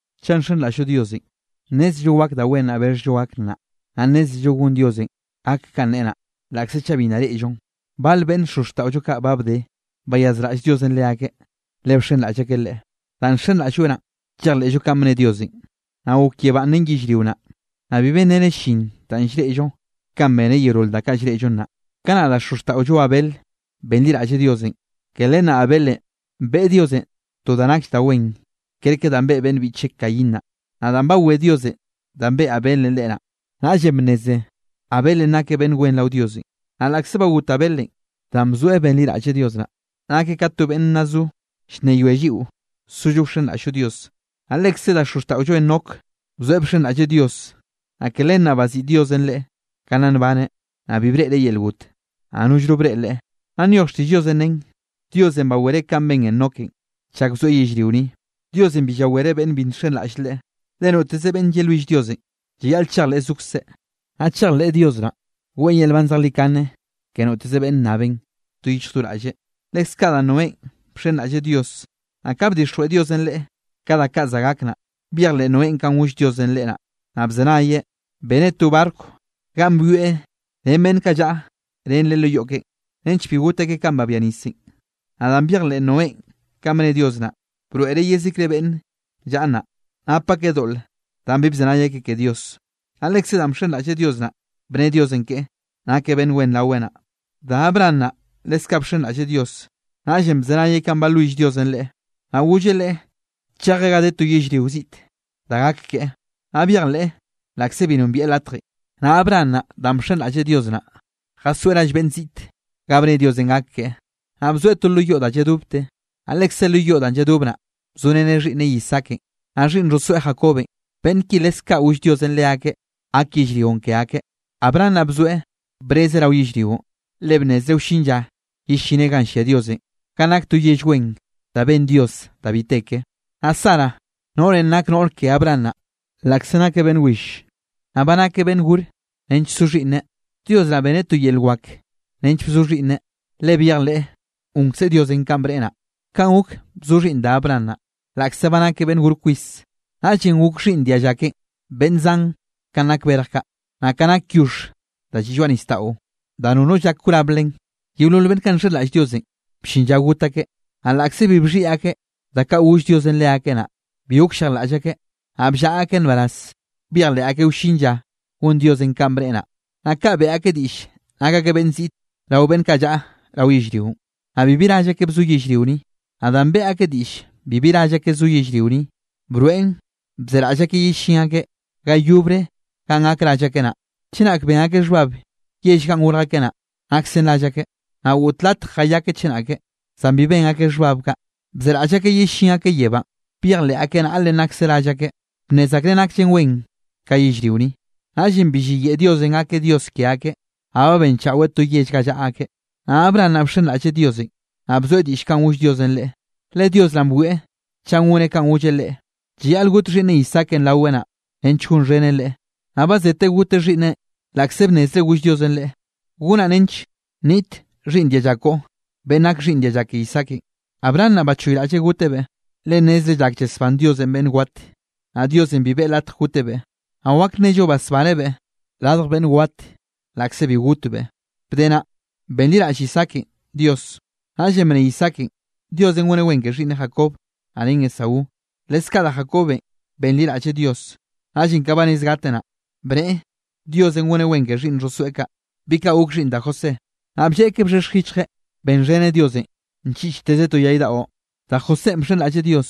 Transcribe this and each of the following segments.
Chaꞌ nxenraꞌll-llo Diosenꞌ, nnézello wak da wen danꞌ bexhllo gak naꞌ, naꞌ nnézello gon Diosenꞌ gak kanꞌ neꞌe naꞌ, laꞌkze chaꞌ bi nna reꞌllon. Bal beꞌnn xozxtaꞌollo kaꞌ ba bde, bayazraꞌll Diosenꞌ leakeꞌ, le bxenraꞌll akeꞌ Leꞌe. Danꞌ nxenraꞌll-lloeꞌ naꞌn, llejleꞌllo kanꞌ bnne Diosenꞌ, naꞌ gok yebánꞌ ren yellrio naꞌ. Naꞌ bi benreneꞌ llin danꞌ llreꞌllo kanꞌ beneꞌ yeolol da kaꞌ llreꞌllo naꞌ. Kanaꞌ da xozxtaꞌollo Abel benliraꞌlleꞌ Diosenꞌ, ke len naꞌ Abelenꞌ beꞌe Diosenꞌ to da nakll da wen, kerke danꞌ beꞌe beꞌnn biꞌcheꞌ Caín naꞌ. Naꞌ danꞌ bawé Diosenꞌ danꞌ beꞌe Abelenꞌ Leꞌe naꞌ, naꞌllenꞌ bnneze Abelenꞌ nakeꞌ beꞌnn wen rao Diosenꞌ. Naꞌ laꞌkze ba got Abelenꞌ, danꞌ bzoeꞌ benliraꞌlleꞌ Dios naꞌ, nakeꞌ ka to beꞌnn nna zo llnneyoe lliꞌo sollo wxenraꞌll-llo Dios. Naꞌ lekze da xozxtaꞌollo Enoc bzoeꞌ bxenraꞌlleꞌ Dios, naꞌ ke len naꞌ baziꞌi Diosenꞌ leꞌe ka nna nbaneꞌ. Naꞌ bi breꞌreꞌ yel got, naꞌ nollno breꞌe leꞌe. Naꞌ nyoj xtiꞌll Diosenꞌ nen, Diosenꞌ bawereꞌ kanꞌ ben Enokenꞌ chak bzoeꞌ yellrio ni. Diosenꞌ bi llawereꞌ beꞌnn bi nxenraꞌll Leꞌe. Le noteze beꞌnn yelwill Diosenꞌ llayaꞌl chejleꞌ zokzeꞌ, naꞌ chejleꞌ Dios naꞌn, weꞌe yel nban zejlikane ke noteze beꞌnn nnabenꞌ do yich do raꞌlle. Leskaꞌ da Noénꞌ, bxenraꞌlleꞌ Dios, naꞌ ka bdixjweꞌ Diosenꞌ leꞌe ka da kaꞌ za gak naꞌ, byejleꞌ Noénꞌ kanꞌ goll Diosenꞌ leꞌe naꞌ, naꞌ bzenayeꞌ beneꞌ to barco ganꞌ byoeꞌ ren beꞌnn kaꞌ llaꞌa ren leꞌe lo yoꞌ keꞌen, nench bi got akeꞌ kanꞌ babia nisenꞌ. Naꞌ danꞌ byejleꞌ Noénꞌ kanꞌ bne Dios naꞌ, broeꞌreꞌ yezikre beꞌnn llaꞌa naꞌ, nap akeꞌ doꞌle danꞌ bi bzenay akeꞌ ke Dios. Naꞌ lekze danꞌ bxenraꞌlleꞌ Dios naꞌ, bne Diosenꞌ keꞌe, nakeꞌ beꞌnn wen raweꞌ naꞌ. Da Abraham naꞌ leskaꞌ bxenraꞌlleꞌ Dios. Naꞌllenꞌ bzenayeꞌ kanꞌ balwill Diosenꞌ leꞌe, naꞌ golleꞌ leꞌe chejeꞌ ga de to yellrio ziꞌte da gak keꞌe. Naꞌ byejleꞌ laꞌkze bi nombieꞌ latjenꞌ. Naꞌ Abraham naꞌ danꞌ bxenraꞌlleꞌ Dios naꞌ, jasoeꞌ rall beꞌnn ziꞌte ga bne Diosenꞌ gak keꞌe. Naꞌ bzoeꞌ to lo yoꞌ da lladobte, naꞌ lekze lo yoꞌ danꞌ lladob naꞌ, bzoreneꞌ xhiꞌnneꞌ Isaakenꞌ, naꞌ xhiꞌnn xhosoeꞌ Jacobenꞌ, beꞌnn ki leskaꞌ goll Diosenꞌ leakeꞌ gak yellrionꞌ ke akeꞌ. Abraham naꞌ bzoeꞌ brezeꞌ rao yellrionꞌ, le bnnezreꞌ wllin lla yellineꞌ ganꞌ llia Diosenꞌ ganꞌ nak to yell wen da ben Dios da bi te ke. Naꞌ Sara noꞌrenꞌ nak noꞌr ke Abraham naꞌ, laꞌkze nakeꞌ beꞌnn will, naꞌ ba nakeꞌ beꞌnn gore nench so xhiꞌnneꞌ, Dios naꞌ beneꞌ to yel wak nench bzo xhiꞌnneꞌ, le byejleꞌ gonkze Diosenꞌ kanꞌ bneꞌe naꞌ. Kaꞌn gok bzo xhiꞌnn da Abraham naꞌ, laꞌkze ba nakeꞌ beꞌnn gor kwis. Naꞌllenꞌ gok xhiꞌnn dialla keꞌen beꞌnn zan kanꞌ nak berj kaꞌ, naꞌ kanꞌ nak yoxh da lliꞌ lloaꞌ nisdaꞌo da nono llak wrab len. Yeolol beꞌnn kaꞌ nxenraꞌll Diosenꞌ, bllin lla got akeꞌ. Naꞌ laꞌkze bi bxhiꞌi akeꞌ da kaꞌ goll Diosenꞌ leakeꞌ naꞌ, bi gokllejlaꞌll akeꞌ, naꞌ bllaꞌa akeꞌ nbaraz byejleꞌ akeꞌ wllin lla gon Diosenꞌ kanꞌ bneꞌe naꞌ. Naꞌ kaꞌ beꞌe akeꞌ diꞌll nak akeꞌ beꞌnn ziꞌte rao beꞌnn kaꞌ llaꞌa rao yellrionꞌ, naꞌ bibi rall akeꞌ bzo yellrio ni. Naꞌ danꞌ beꞌe akeꞌ diꞌll bibi rall akeꞌ zo yellrio ni, broeꞌn bzeraꞌll akeꞌ yellín akeꞌ ga yobre ganꞌ gak rall akeꞌ naꞌ. Chenak ben akeꞌ xhbab yell ganꞌ gorj akeꞌ naꞌ, naksen rall akeꞌ, naꞌ goꞌt latj jayakeꞌ chenake, zan bi ben akeꞌ xhbab kaꞌ. Bzeraꞌll akeꞌ yellín akeꞌ yebánꞌ, byejleꞌ akeꞌ naꞌlenꞌ nakse rall akeꞌ, bnnez akreꞌ nakllen wen ka yellrio ni. Naꞌllenꞌ bi lliyeꞌe Diosenꞌ gakeꞌ Dios ke akeꞌ, naꞌ ba benchaꞌweꞌ to yell ga llaꞌa akeꞌ. Naꞌ Abraham naꞌ bxenraꞌlleꞌ Diosenꞌ, naꞌ bzoeꞌ diꞌll kanꞌ goll Diosenꞌ leꞌe, le Dios naꞌn bwieꞌ chaꞌ goneꞌ kanꞌ golleꞌ leꞌe, llayaꞌl got xhiꞌnneꞌ Isaakenꞌ raweꞌ naꞌ, nench gonxheneꞌ Leꞌe. Naꞌ ba zeteꞌ goteꞌ xhiꞌnneꞌn laꞌkze bnnezreꞌ goll Diosenꞌ leꞌe: “Gonaꞌ nench nniꞌt xhiꞌnn dialla koꞌo beꞌnn gak xhiꞌnn dialla ke Isaakenꞌ.” Abraham naꞌ bachoyraꞌlleꞌ gotebeꞌ, le nnezreꞌ llak llasbán Diosenꞌ beꞌnn wat. Naꞌ Diosenꞌ bi beꞌe latj gotebeꞌ. Naꞌ wak nnello basbanebeꞌ radj beꞌnn wat laꞌkze bi gotbeꞌ. Bde naꞌ benliraꞌll Isaakenꞌ Dios. Naꞌllenꞌ bne Isaakenꞌ Diosenꞌ goneꞌ wen ke xhiꞌnneꞌ Jacob naꞌ ren Esaú. Leskaꞌ da Jacobenꞌ benliraꞌlleꞌ Dios. Naꞌllenꞌ kanꞌ ba rez gateꞌ naꞌ, bneꞌe Diosenꞌ goneꞌ wen ke xhiꞌnn xhosoeꞌ kaꞌ, bi kaꞌ gok xhiꞌnn da José. Naꞌ blleꞌkeꞌ bxhexj yichjeꞌn beꞌxheneꞌ Diosenꞌ nchiꞌchteze to yay daꞌo. Da Josénꞌ bxenraꞌlleꞌ Dios,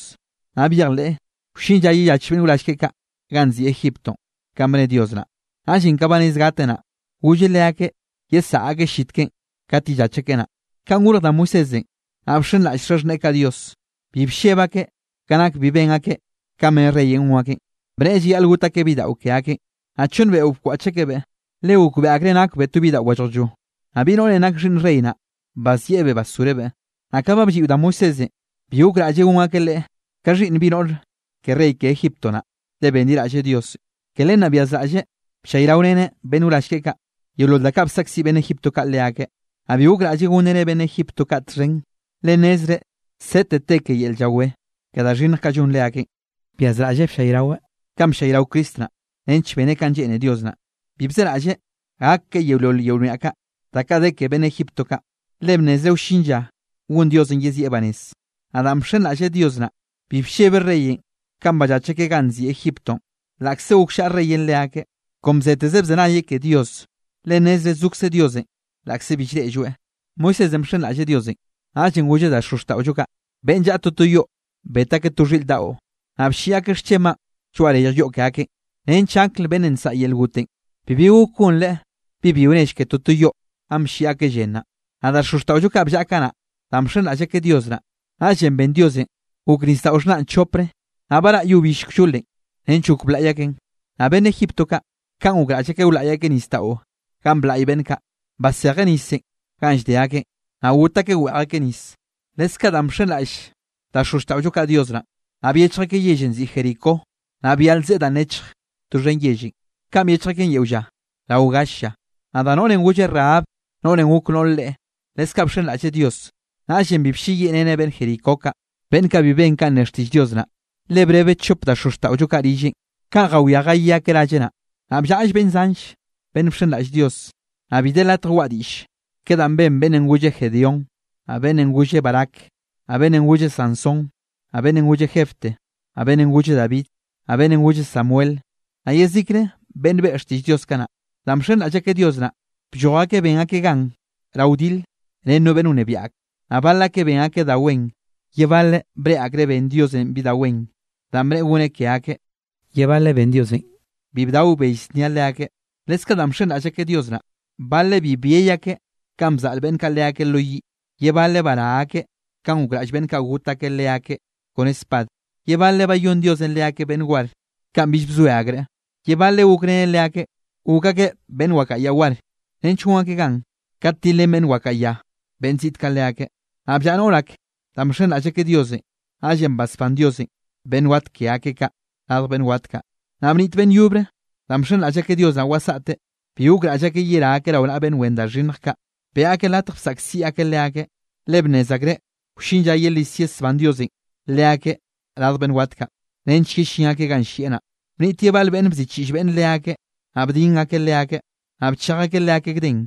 naꞌ byejleꞌ wllin lla yellach beꞌnn wrall keꞌe kaꞌ ganꞌ nziꞌi Egiptonꞌ kanꞌ bne Dios naꞌ. Naꞌllenꞌ ka ba rez gateꞌ naꞌ, golleꞌ leakeꞌ yesaꞌa akeꞌ llit keꞌen kat yellach akeꞌ naꞌ. Kanꞌ gorj da Moisésenꞌ, naꞌ bxenraꞌll xaxhneꞌe kaꞌ Dios, bi blleb akeꞌ ka nak bi ben akeꞌ kanꞌ bne reyenꞌ gon akeꞌn, bneꞌe llayaꞌl got akeꞌ bidaꞌo ke akeꞌn. Naꞌ chonn beꞌo bkwaꞌch akebeꞌ, le gokbeꞌe akreꞌ nakbeꞌ to bidaꞌo wallejllo. Naꞌ bi noꞌrenꞌ nak xhiꞌnn rey naꞌ, bazieꞌbeꞌ basgorebeꞌ. Naꞌ ka ba blliꞌo da Moisésenꞌ, bi gokraꞌlleꞌ gon akeꞌ leꞌe ka xhiꞌnn bi noꞌr ke rey ke Egipto naꞌ, le benliraꞌlleꞌ Dios. Ke len naꞌ byazraꞌlleꞌ bllayraoreneꞌ beꞌnn wrall keꞌe kaꞌ, yeolol danꞌ bsaꞌkziꞌ beꞌnn Egipto kaꞌ leakeꞌ, naꞌ bi gokraꞌlleꞌ gonreneꞌ beꞌnn Egipto kaꞌ txhen, le nnezreꞌ sete te ke yel llawé ke da xhinnj kaꞌ llon leakeꞌn. Byazraꞌlleꞌ bllayraweꞌ kanꞌ bllayrao Cristo naꞌ, nench beneꞌ kanꞌ lleꞌne Dios naꞌ, bi bzeraꞌlleꞌ gak keꞌe yeolol yel wniaꞌ ka da kaꞌ de ke beꞌnn Egipto kaꞌ, le bnnezreꞌ wllin lla gon Diosenꞌ yezieꞌ banez. Naꞌ danꞌ bxenraꞌlleꞌ Dios naꞌ, bi bllebeꞌ reyenꞌ kanꞌ ballach akeꞌ ganꞌ nziꞌi Egiptonꞌ, laꞌkze gokllaꞌa reyenꞌ leakeꞌ, kon bzeteze bzenayeꞌ ke Dios, le nnezreꞌ zokze Diosenꞌ laꞌkze bi llreꞌlloeꞌ. Moisésenꞌ bxenraꞌlleꞌ Diosenꞌ, naꞌllenꞌ golleꞌ da xozxtaꞌollo kaꞌ, beꞌnn llaꞌa toto yoꞌ bet akeꞌ to xhiꞌr daꞌo, naꞌ blliꞌ akeꞌ xchenbaꞌn lloaꞌ reyj yoꞌ ke akeꞌn, nench angl beꞌnnenꞌ nsaꞌa yel gotenꞌ, bibi gok gonreꞌ bi byio nell ke toto yoꞌ ganꞌ blliꞌ akeꞌ llen naꞌ. Naꞌ da xozxtaꞌollo kaꞌ bllaꞌa kanaꞌ, danꞌ bxenraꞌll akeꞌ Dios naꞌ, naꞌllenꞌ ben Diosenꞌ gok Nisdaꞌo Xhnanꞌ chopre, naꞌ baraꞌ yo bill kllolenꞌ nench gok blaꞌy akeꞌn. Naꞌ beꞌnn Egipto kaꞌ, kanꞌ gokraꞌll akeꞌ wlaꞌy akeꞌ nisdaꞌo ganꞌ blaꞌy beꞌnn kaꞌ, basejeꞌ nisenꞌ ganꞌ llde akeꞌn, naꞌ got akeꞌ weꞌj akeꞌ nis. Leskaꞌ danꞌ bxenraꞌll da xozxtaꞌollo kaꞌ Dios naꞌn, naꞌ byechj akeꞌ yellenꞌ nziꞌi Jericó, naꞌ byal zeꞌe danꞌ nechj doxhen yellenꞌ, kanꞌ byechj akeꞌn yeo lla rao gall lla. Naꞌ da noꞌrenꞌ golle Rahab, noꞌrenꞌ gok noꞌr reꞌe, leskaꞌ bxenraꞌlleꞌ Dios, naꞌllenꞌ bi blleyiꞌreneꞌ beꞌnn Jericó kaꞌ, beꞌnn kaꞌ bi ben kanꞌ ne xtiꞌll Dios naꞌ, le brebeꞌ chop da xozxtaꞌollo kaꞌ rilleꞌn kanꞌ jawiá jayí akeꞌ ralleꞌ naꞌ. Ba bllaꞌll beꞌnn zanlle beꞌnn bxenraꞌll Dios, naꞌ bi de latj waꞌa diꞌll ke danꞌ ben beꞌnnenꞌ golle Gedeón, naꞌ beꞌnnenꞌ golle Barac, naꞌ beꞌnnenꞌ golle Sansón, naꞌ beꞌnnenꞌ golle Jefté, naꞌ beꞌnnenꞌ golle David, naꞌ beꞌnnenꞌ golle Samuel, naꞌ yezikre beꞌnn beꞌe xtiꞌll Dios kanaꞌ. Danꞌ bxenraꞌll akeꞌ Dios naꞌ, blloj akeꞌ ben akeꞌ gan rao wdile ren no beꞌnn wnebiaꞌ ak, naꞌ bal akeꞌ ben akeꞌ da wen, ye baleꞌ breꞌe akreꞌ ben Diosenꞌ bi da wen danꞌ bneꞌe goneꞌ ke akeꞌ, ye baleꞌ ben Diosenꞌ bi bdao bell znia leakeꞌ. Leskaꞌ danꞌ bxenraꞌll akeꞌ Dios naꞌ, baleꞌ bi byey akeꞌ kanꞌ bzaꞌl beꞌnn kaꞌ leakeꞌ lo yiꞌ, ye baleꞌ bará akeꞌ kanꞌ gokraꞌll beꞌnn kaꞌ got akeꞌ leakeꞌ kone spad, ye baleꞌ bayón Diosenꞌ leakeꞌ beꞌnn war kanꞌ bill bzoe akreꞌ, ye baleꞌ gokreneꞌ leakeꞌ gok akeꞌ beꞌnn wakaꞌa ya war, nench gon akeꞌ gan kat tilrén beꞌnn wakaꞌa ya beꞌnn ziꞌt kaꞌ leakeꞌ. Naꞌ bllaꞌa noꞌr ak, danꞌ bxenraꞌll akeꞌ Diosenꞌ, naꞌllenꞌ basbán Diosenꞌ beꞌnn wat ke akeꞌ kaꞌ radj beꞌnn wat kaꞌ. Naꞌ bniꞌt beꞌnn yobre, danꞌ bxenraꞌll akeꞌ Dios naꞌ wasaꞌte, bi gokraꞌll akeꞌ yerá akeꞌ rao naꞌa beꞌnn wen da xhinnj kaꞌ. Beꞌe akeꞌ latj bsaꞌkziꞌ akeꞌ leakeꞌ, le bnnez akreꞌ wllin lla yelis yesbán Diosenꞌ leakeꞌ radj beꞌnn wat kaꞌ, nench yellín akeꞌ ganꞌ llieꞌ naꞌ. Bniꞌt ye bal beꞌnn bziꞌchiꞌll beꞌnn leakeꞌ, naꞌ bdin akeꞌ leakeꞌ, naꞌ bchej akeꞌ leakeꞌ gden,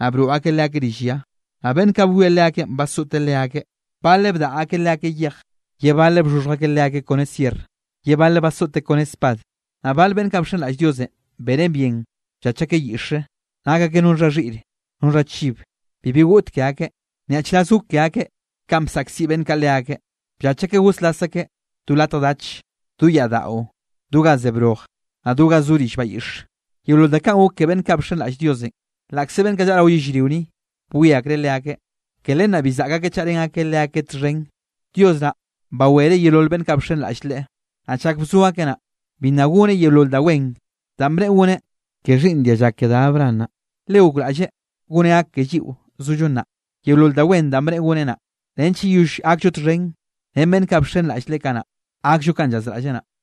naꞌ broꞌ akeꞌ leakeꞌ rill ya. Naꞌ beꞌnn kaꞌ bwie leakeꞌn basoꞌte leakeꞌ, baleꞌ bdaꞌa akeꞌ leakeꞌ yej, ye baleꞌ bxhoxhj akeꞌ leakeꞌ kone sierr, ye baleꞌ basoꞌte kone spad. Naꞌ bal beꞌnn kaꞌ bxenraꞌll Diosenꞌ, bene bien bllach akeꞌ yiꞌxre, nak akeꞌ no xha xhiꞌre, no xha chib. Bibi goꞌt ke akeꞌ, nyaꞌchraz gok ke akeꞌ kanꞌ bsaꞌkziꞌ beꞌnn kaꞌ leakeꞌ. Bllach akeꞌ goslas akeꞌ do latj dach, do yaꞌdaꞌo, do ga ze broj, naꞌ do ga zo rill bayiꞌxe. Yeolol da kaꞌn gok ke beꞌnn kaꞌ bxenraꞌll Diosenꞌ, laꞌkze beꞌnn kaꞌ llaꞌa rao yellrio ni, bwie akreꞌ leakeꞌ, ke len naꞌ bi zaꞌk akeꞌ chaꞌrén akeꞌ leakeꞌ txhen. Dios naꞌ bawereꞌ yeolol beꞌnn kaꞌ bxenraꞌll Leꞌe, naꞌ chak bzo akeꞌ naꞌ, bi nna goneꞌ yeolol da wen danꞌ bneꞌe goneꞌ ke xhiꞌnn dialla ke da Abraham naꞌ. Le gokraꞌlleꞌ goneꞌ gak ke lliꞌo zollo nnaꞌ, yeolol da wen danꞌ bneꞌe goneꞌ naꞌ, nench yeyoll gakllo txhen ren beꞌnn kaꞌ bxenraꞌll Leꞌe kanaꞌ, gakllo kanꞌ llazraꞌlleꞌ naꞌ.